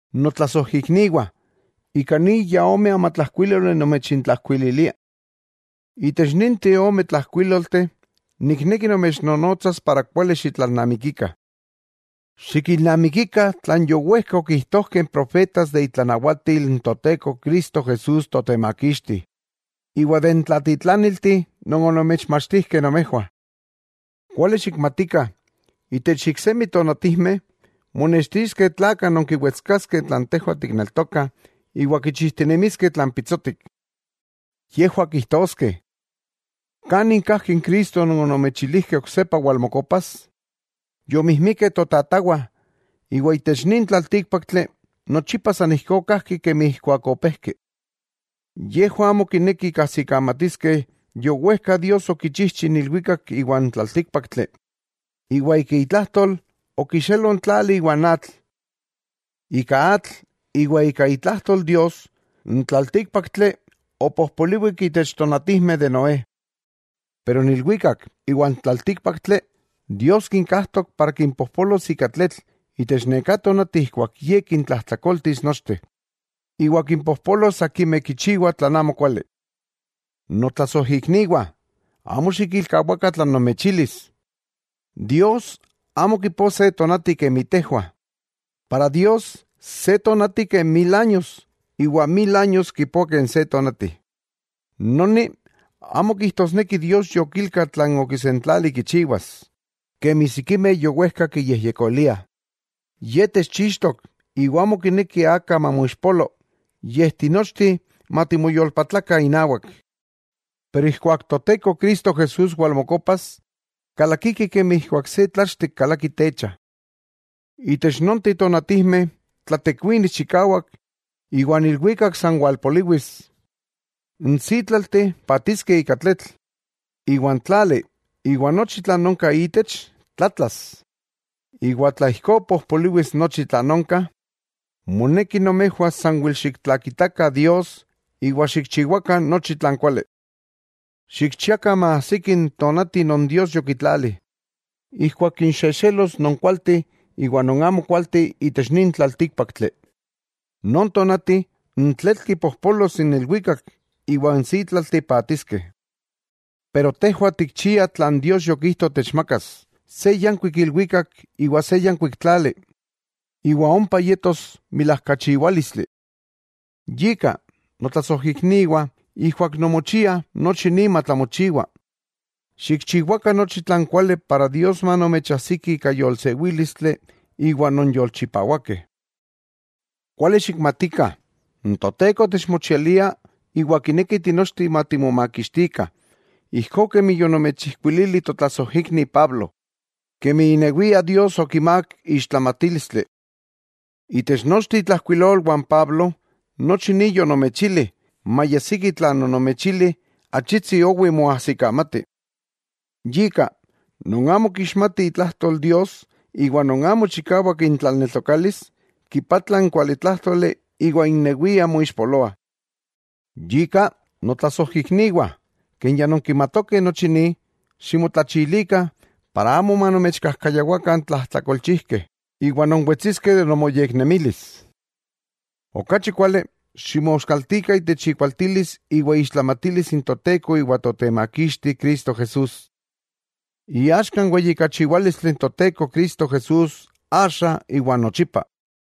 Notlasojikniwah, ika ni ya ome amatlajkuíloli nomechintlajkuililia. Itech ninteh omeh tlajkuilolteh nikneki nomechnonotsas para kuali xitlalnamikikah. Xikilnamikikah tlan yowejka okijtojkeh n profetas de itlanawatil n Toteko Cristo Jesús Totemakixti, iwa de n tlatitlaniltih non onomechmachtijkeh nomejwah. Kuali xikmatikah, itech iksemi tonatijmeh monextiskeh tlakah non kiwetskaskeh tlan tejwah tikneltokah, iwa kichijtinemiskeh tlan pitsotik. Yejwah kijtoskeh: “¿Kanin kajki n Cristo non onomechilijkeh oksepa walmokopas? Yomijmikeh totatawah, iwa itech nin tlaltíkpaktli nochipa san ijkó kajki kemi ijkuak opejki.” Yejwah amo kinekih kajsikamatiskeh yowejka Dios okichijchi n ilwikak iwa n tlaltíkpaktli, iwa ika itlajtol okixelo n tlali iwa n atl. Ika atl iwa ika itlajtol Dios, n tlaltíkpaktli opojpoliwik itech tonatijmeh de Noé. Pero n ilwikak iwa n tlaltíkpaktli, Dios kinkajtok para kimpojpolos ika tletl itech neká tonati ijkuak Ye kintlajtlakoltis nochteh, iwa kimpojpolos akimeh kichiwah tlan amokuali. Notlasojikniwah, amo xikilkawakah tlan nomechilis, Dios amo kipoa se tonati kemi tejwah. Para Dios se tonati ken mil años, iwa mil años kipoa ken se tonati. Noni amo kijtosneki Dios yokilka tlan okisentlali kichiwas, kemi sikimeh yowejka kiyejyekoliah, yej techchixtok iwa amo kineki aka mamoixpolo, yej tinochteh matimoyolpatlakah inawak. Pero ijkuak Toteko Cristo Jesús walmokopas, kalakiki kemi ijkuak se tlachtek kalaki techa. Itech nonteh tonatijmeh tlatekuinis chikawak iwa n ilwikak san walpoliwis, n sítlalteh paatiskeh ika tletl, iwa n tlali iwa nochi tlan onka itech, tlatlas. Iwa tla ijkó pojpoliwis nochi tlan onka, ¡moneki nomejwah sanwel xiktlakitakah Dios iwa xikchiwakah nochi tlan kuali! Xikchiakah maajsiki n tonati non Dios yokitlali, ijkuak kinxexelos non kualteh iwa non amokualteh itech nin tlaltíkpaktli. Non tonati n tletl kipojpolos n ilwikak iwa n sítlalteh paatiskeh. Pero tejwah tikchiah tlan Dios yokijto techmakas, se yankuik ilwikak iwa se yankuik tlali, iwa ompa yetos milajkachiwálistli. Yika, notlasojikniwah, ijkuak nonmochiah nochi ni matlamochiwa, xikchiwakah nochi tlan kuali para Dios manomechajsiki ika yolsewílistli iwa non yolchipawakeh. Kuali xikmatikah n Toteko techmochialia iwa kineki tinochteh matimomakixtikah; ijkó kemi yonomechijkuilili totlasojikni Pablo, kemi inewia Dios okimák ixtlamatílistli. Itech nochteh itlajkuilolwah n Pablo nochi ni yonomechili, maya siki tlan onomechili achitsi owi moajsikamati. Yika, non amo kixmatih itlajtol Dios iwa non amo chikawak intlaneltokalis kipatla n kualitlájtoli iwa innewiah moixpoloah. Yika, notlasojikniwah, ken ya nonkimatokeh nochi ni, ximotlachilikah, para amo manomechkajkayawakah n tlajtlakolchijkeh, iwa nonwetsiskeh de nomoyeknemilis. Okachi kuali, ximoskaltikah itech ikualtilis iwa iixtlamatilis n Toteko iwa Totemakixti Cristo Jesús. ¡Iaxka n weyijkachiwalístli n Toteko Cristo Jesús, axa iwa nochipa!